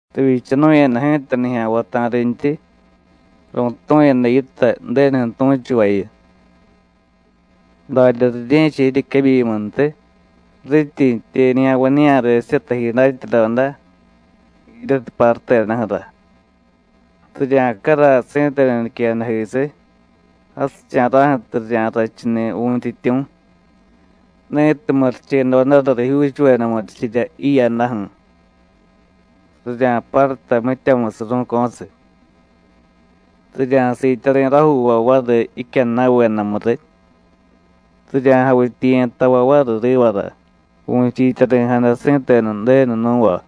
Rivyichanu̱yada ji̱ta nijya̱nvay ta̱rintyi, ru̱tu̱yada yitay Ju̱denuju̱ tu̱chuvayu. Darya rirye̱cha jiryequebyimuntiy rityi jitye nijya̱nvañiya̱resirya taji datyadoda, jiryatiy parutedaju̱ra. Rirya̱caray si̱tenu niquejadajisiy jasicha̱ra̱ju̱tiy rirya̱rrachuni̱ Vu̱yntyityu̱, ni̱tiy murichedodara rijyuuchuveda murichirya jiyadaju̱. Rirya̱parutay mityamusiy ru̱co̱siy. Rirya̱siityari̱ rajuuvay variy jicyadnavedamu riy, rirya̱javityiye̱ tavay variy rivara vu̱chiityari̱jada si̱tenu Ju̱denu nú̱va.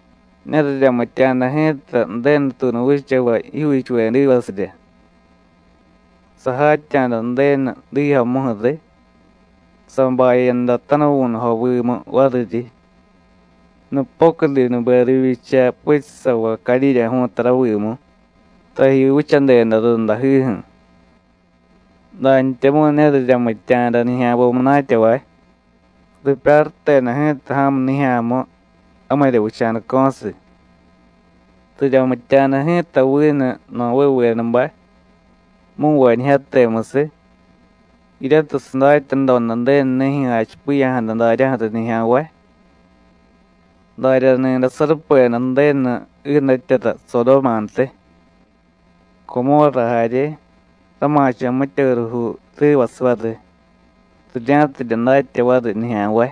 Ne riryamitya̱da ji̱ta Ju̱denutuunu vichavay jijyuuchuvedivasirya. Sajatya̱da Ju̱denu diijyomuju̱ riy, sabayada tanuvu̱nujovimu variryi, nupocudinube rivyicha puchusavay cadyidyaju̱u̱ta ravimu, taji vichadeda rundajiju̱. Dantyamu̱y ne riryamitya̱da nijya̱nvay munatyavay, ripyaruteda ji̱ta ja̱mu nijya̱mu, jamirya vicha̱daco̱siy. Riryamitya̱da ji̱ta vinu Novévedabay, mu̱nvañijyatemusiy, jiryatiy sadatyadoda Ju̱denunijyu̱ jachipiya̱jada daryaju̱ riy nijya̱nvay. Daryani̱day sarupeda Ju̱denu jiidatyara Sodómantiy, Comórra jarye, rama̱cho̱ mitya jurujuu rivasiy variy, rirya̱tidye datya variy nijya̱nvay,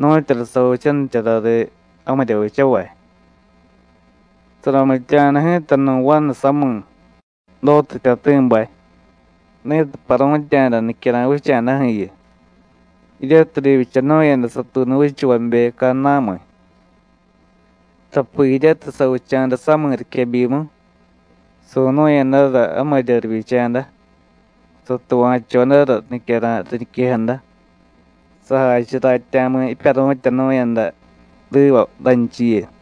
nu̱tyura savichanichara riy jamirya vichavay. Saramitya̱da ji̱ta nu̱ vanu sami̱, Dótu jtyati̱bay, ni̱tiy paru̱tya̱da nicyara̱y vicha̱daju̱yu, jiryatiy rivyichanu̱yada satuunu vichavabe cadnamiy. Tapi jiryatiy savicha̱da sami̱ riquebyimu, su̱nu̱yadara jamirya rivyicha̱da, satuva̱chodara nicyara̱y riñiquejada, sajachiy ratya̱mu jipyaru̱tyanu̱yada riva ranchiyu.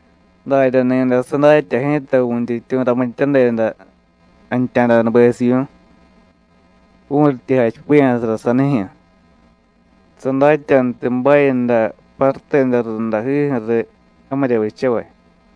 Daryani̱day sadatya ji̱ta Vu̱yntyityu̱ ramityadeda jantya̱danubesivyu̱y, vu̱ryityi jachipiya̱sara sanijyu̱; sadatyantiy bayada paruteda rundajiju̱ riy jamirya vichavay.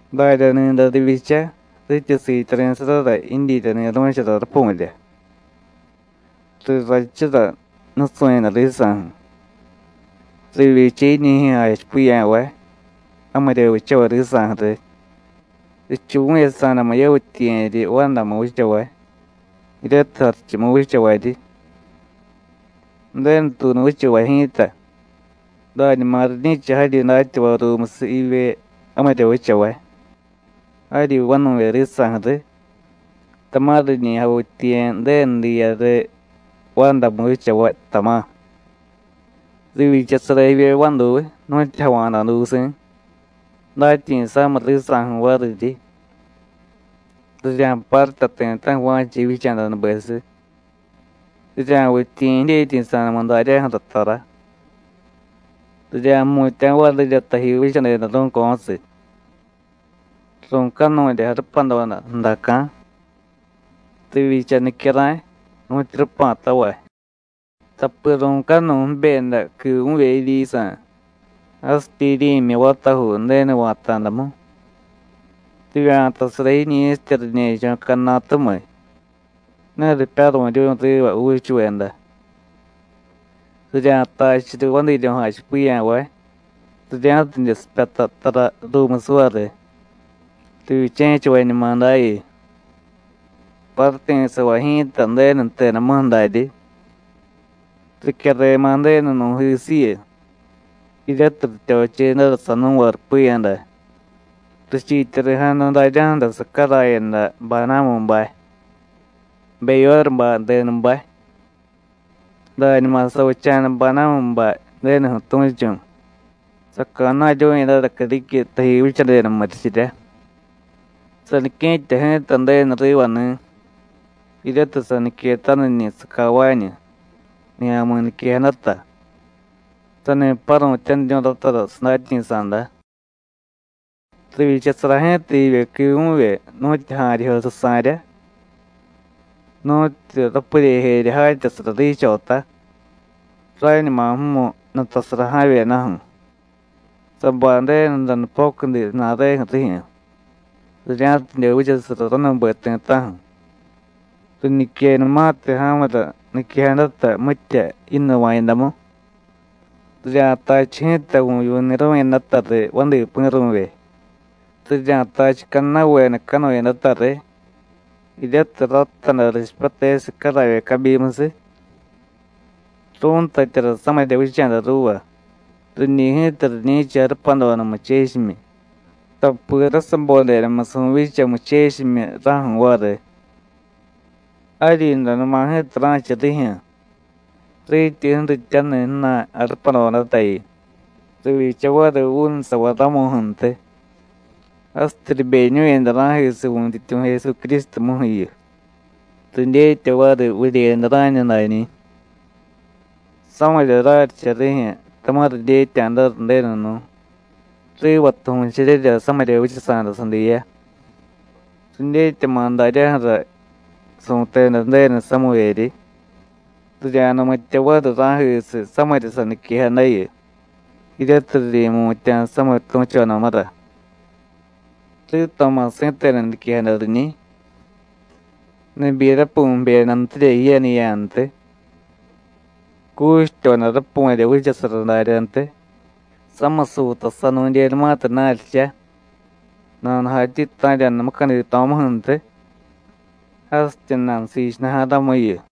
Daryani̱day rivyicha rityi siityari̱sarara jidyirya ni̱ru̱chara rapu̱rya, rirrachura nusu̱yada risa̱ju̱. Rivyicha jiñijyu̱ jachipiya̱vay, jamirya vichavay risa̱ju̱ riy, richuvu̱yasa̱damu yavityiye̱ryi vandamu vichavay, jiryatiy jarichumu vichavaryi. Ju̱denu tuunu vichavay ji̱ta, dañuma riñi̱cha jaryi datyavay ruumusiy jivye jamirya vichavay, jaryi vanu̱vye risa̱ju̱ riy, tama̱ riñi javityiye̱ Ju̱denu diya riy vandamu vichavay, tama̱. Rivyichasara jivye vaduy nu̱tyu java̱da dusi̱, datyi̱sa̱miy risa̱ju̱ variryi. Rirya̱parutay ti̱ta̱ju̱ va̱cha jivyicha̱danubesiy, rirya̱vityiye̱ jidyetyi̱sa̱damu daryaju̱ra tara. Rirya̱jmutya̱ varirya taji vichadeda ru̱co̱siy. Ru̱canurya jarupadoda ju̱daca̱. Rivyicha nicyara̱y, nu̱tyu rupa̱tavay, tapi ru̱canuy jibyeda quivu̱vye jiryisa̱, jasityi jiryi̱myi vatajuu Ju̱denu va̱ta̱damu. Rivya̱tasara jiñi̱sitya riñe̱cho̱ cadnatumiy, ne ripyaru̱ryu̱y riva juuchuveda. Rirya̱tachu riy vadiiryo̱ jachipiya̱vay, rirya̱tidye sipyata tara ruumusiy variy; rivyiche̱chavañumadayu. ¡Paruti̱savay ji̱ta Ju̱denu jtedamuju̱ daryi! Ricyarema̱ Ju̱denu nu̱jisiyu, jiryatiy rityochedara sanú̱va rupiyada, richiityari̱jada daryaju̱ra sacarayada Badámubay, Beyórubay denubay. Dañuma savicha̱da Badámubay Ju̱denuju̱ tu̱chu̱, saca̱na̱ryu̱yadara criquiy taji vichadeda murichirya. Sanique̱tya ji̱ta Ju̱denu rivani̱, jiryatiy saniquetaniñi̱ sacavañu, nijya̱mi̱ niquejadata, sani paru̱tyaniryu̱y ratara sadatyi̱sa̱da. Rivyichasara ji̱ta jivye quivu̱vye nu̱tyu ja̱ryijyo susa̱rya, nu̱tyu rapuryejerya jatyasara riichota (rañuma jmu nutasara ja̱vyedaju̱), sabay Ju̱denura nupocudi ju̱na̱reju̱ rijyu̱, rirya̱tidye vichasara ranube ti̱ta̱ju̱. Riñiquenumatiy ja̱mura niquejadata mitya yinnuva̱yadamu, rirya̱tachu ji̱ta vu̱vyu̱ ni̱ru̱yadata riy vadi pi̱ru̱vye; rirya̱tachu cadnavedacanuyadata riy, jiryatiy radtaday richipyatesiy caravye cabyimusiy. Ru̱ntatyara samirya vicha̱da ruuva, riñi̱ ji̱ta riñi̱cha jarupadoda muchechimyi, tapi rasabodedamusiy vu̱vyicha muchechimyi raju̱ variy. Jaryinranuma ji̱ta ra̱cha rijyu̱ rityi ju̱rityaniy ju̱na̱y jarupadodatayu, rivyicha variy vuunusavay ramuju̱ntiy, jasityi ribeñu̱yada ra̱jisiy Vu̱yntyityu̱ Jesucrístumuju̱yu, ridyetya variy vuryeyada rá̱ñu dañi̱. Samirya raryicha rijyu̱ tama̱ ridyetya̱dara Ju̱denu nú̱, rivatiy vu̱cheryerya samirya vichasa̱da sadiya; ridyetyama̱ daryaju̱ra su̱teda Ju̱denu samivyeryi, rirya̱numitya variy ra̱jisiy samirya saniquejadayu, jiryatiy riryi̱mutya̱ samitu̱chodamura. Rito̱ma̱ si̱tenu niquejada riñiy: “Nibyi rapu̱y jbyedantirya jiyaniya̱ntiy; cuchityoda rapu̱rya vichasara daryantiy, samiy suutasanu̱dyenumatiy naryicha, nanujatyi ta̱rya̱da mucadito̱muju̱ntiy, jasityi nanusiichunuja̱ ramuyu.”